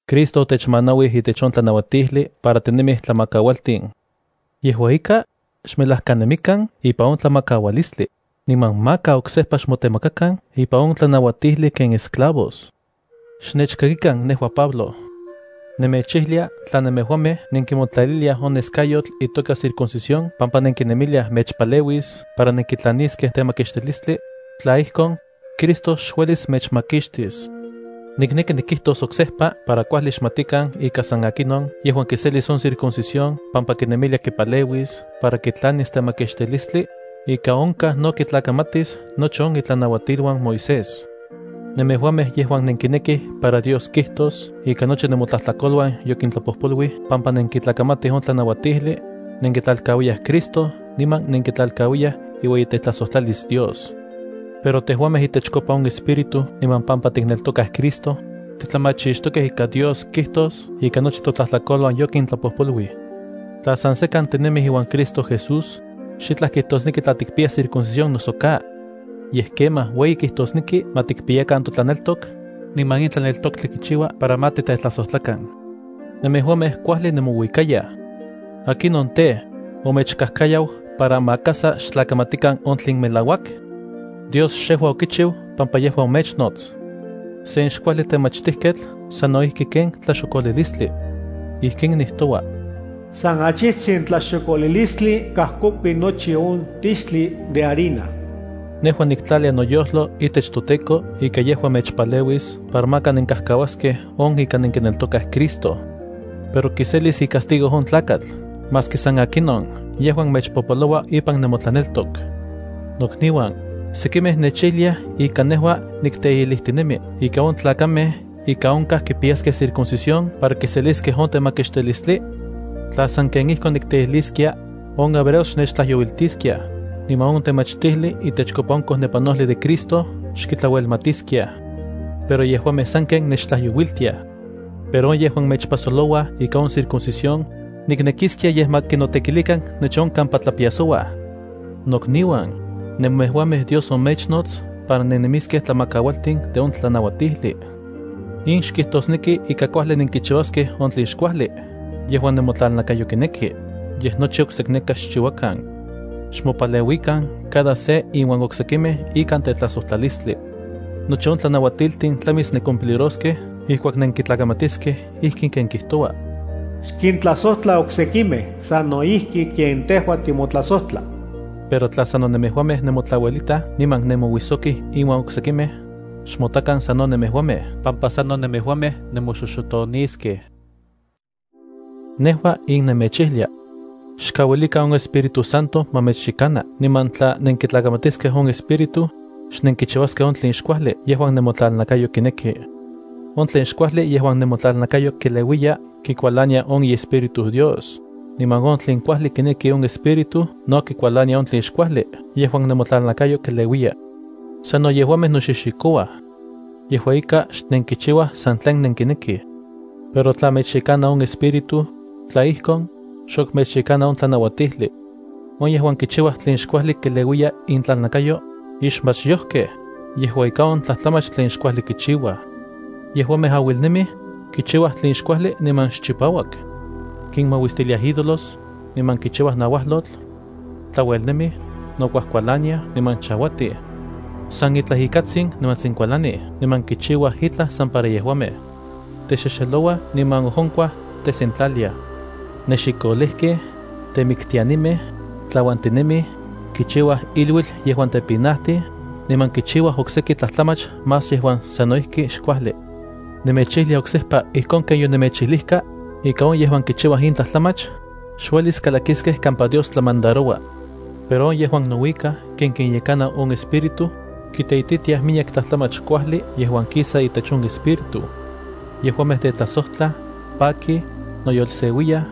Cristo otechmanauij itech on tlanauatijli para tinemij tlamakaualtin. Yejua ika, xmelajkanemikan ipan on tlamakaualistli, niman maka oksejpa xmotemakakan ipan on tlanauatijli ken esclavos. Xnechkakikan. Nejua Pablo nemechijlia tla nemejuamej nenkimotlaliliaj on neskayotl itoka circuncisión pampa nenkinemiliaj mechpaleuis para nenkitlaniskej temakixtilistli, tla ijkon, Cristo xuelis mechmakixtis. Nikneki nikijtos oksejpa para kuajli xmatikan ika san akinon yejuan kiselis on circuncisión pampa kinemilia kipaleuis para kitlanis temakixtilistli, ika onkaj no kitlakamatis nochi on itlanauatiluan Moisés. Nemejuamej yejuan nenkinekij para Dios kijtos ika nochi nemotlajtlakoluan yokintlapojpoluij pampa nenkitlakamatij on tlanauatijli, nenkitlalkauiyaj Cristo niman nenkitlalkauiyaj iueyitetlajsojtlalis Dios. Pero tejuamej itechkopa on Espíritu niman pampa tikneltokaj Cristo, titlamachixtokej ika Dios kijtos ika nochi totlajtlakoluan yokintlapojpoluij. Tla san sekan tinemij iuan Cristo Jesús, xitlaj kijtosneki tla tikpiyaj circuncisión noso ka. Yej kemaj ueyi kijtosneki ma tikpiyakan totlaneltok, niman in tlaneltoktli kichiua para ma titetlajsojtlakan. Nemejuamej kuajli nemouikayaj. ¿Akinon tej, omechkajkayau para maka sa xtlakamatikan on tlen melauak? Dios xejua okichiu, pampa yejua omechnots. Sen xkuajli temachtijketl sano ijki ken tlaxokolilistli. Ijkin nijtoua: “San achijtsin tlaxokolilistli kajkokui nochi on tixtli de harina.” Nejua niktlalia noyojlo itech toTEKO ika yejua mechpaleuis para maka nenkajkauaskej on ika nenkineltokaj Cristo. Pero kiselis icastigo on tlakatl maski san akinon yejuan mechpopoloua ipan nemotlaneltok. Nokniuan, ¿sekimej mechijliaj ika nejua nikteijlijtinemi ika on tlakamej ika onkaj kipiyaskej circuncisión para kiseliskej on temakixtijli? Tla sanken ijkon nikteijliskia, on hebreos xnechtlajyouiltiskiaj, niman on temachtilistli itechkopa on kojnepanol de Cristo xkitlauelmatiskiaj. Pero yejuamej sanken nechtlajyouiltiaj. Pero on yejuan mechpasolouaj ika on circuncisión, ¡niknekiskia yej ma kinotekilikan nochi on kampa tlapiasouaj! Nokniuan, nemejuamej Dios omechnots para nennemiskej tlamakaualtin de on tlanauatijli. In xkijtosneki ika kuajli nenkichiuaskej on tlen xkuajli yejuan nemotlalnakayo kineki, yej nochi oksekneka xchiuakan. Xmopaleuikan cada se inuan oksekimej ikan tetlajsojtlalistli. Nochi on tlanauatiltin tlamis nencumpliroskej ijkuak nenkitlakamatiskej ijkin ken kijtoua: “Xkintlajsojtla oksekimej sano ijki ken tejua timotlajsojtla.” Pero tla sano nemejuamej nemotlauelitaj niman nemouijsokij inuan oksekimej, xmotakan sano nemejuamej pampa sano nemejuamej nemoxoxotoniskej. Nejua in nemechijlia: Xkauilikan on Espíritu Santo ma mechyekana. Niman tla nenkitlakamatiskej on Espíritu, xnenkichiuaskej on tlen xkuajli yejuan nemotlalnakayo kineki. On tlen xkuajli yejuan nemotlalnakayo keleuiya kikualania on iEspíritu Dios, niman on tlen kuajli kineki on Espíritu no kikualania on tlen xkuajli yejuan nemotlalnakayo keleuiya. Sano yejuamej noxixikouaj. Yejua ika, xnenkichiuaj san tlen nenkinekij. Pero tla mechyekana on Espíritu, tla ijkon, xok mechyekana on tlanauatijli. On yejuan kichiuaj tlen xkuajli keleuiya intlalnakayo, ixmachyojkej, yejua ika on tlajtlamach tlen xkuajli kichiuaj. Yejuamej auilnemij, kichiuaj tlen xkuajli niman xchipauak. Kinmauistiliaj ídolos, niman kichiuaj nauajlotl. Tlauelnemij, nokuajkualaniaj niman chauatij. San itlaj ikatsin nimantsin kualanij niman kichiuaj itlaj san para yejuamej. Texexelouaj niman ojonkuaj tesentlaliaj. Nexikolejkej, temiktianimej, tlauantinemij, kichiuaj iluitl yejuan tepinajtij, niman kichiuaj okseki tlajtlamach más yejuan sano ijki xkuajli. Nemechijlia oksejpa ijkon ken yonemechijlijka, ika on yejuan kichiuaj in tlajtlamach, xuelis kalakiskej kampa Dios tlamandaroua. Pero on yejuan nouikaj ken kinyekana on Espíritu, kiteititiaj miyek tlajtlamach kuajli yejuan kisa itech on Espíritu. Yejuamej tetlajsojtlaj, pakij, noyolseuiyaj,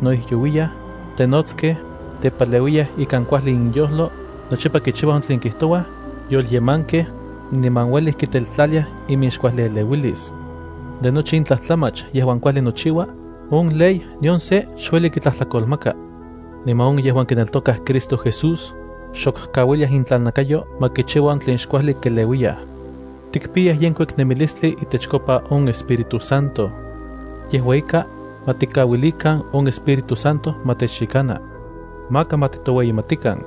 noijyouiyaj, tenotskej, tepaleuiyaj ikan kuajli inyojlo, nochipa kichiuaj on tlen kijtouaj, yolyemankej, niman ueli kiteltlaliaj iminxkuajlieleuilis. De nochi in tlajtlamach yejuan kuajli nochiua, on ley nion se xueli kitlajtlakolmaka. Niman on yejuan kineltokaj Cristo Jesús, xok kauiliaj intlalnakayo ma kichiua on tlen xkuajli keleuiyaj. Tikpiyaj yenkuik nemilistli itechkopa on Espíritu Santo. Yejua ika, ma tikauilikan on Espíritu Santo ma techyekana. Maka ma titoueyimatikan.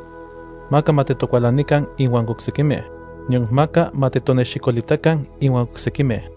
Maka ma titokualanikan inuan oksekimej, nion maka ma titonexikolitakan inuan oksekimej.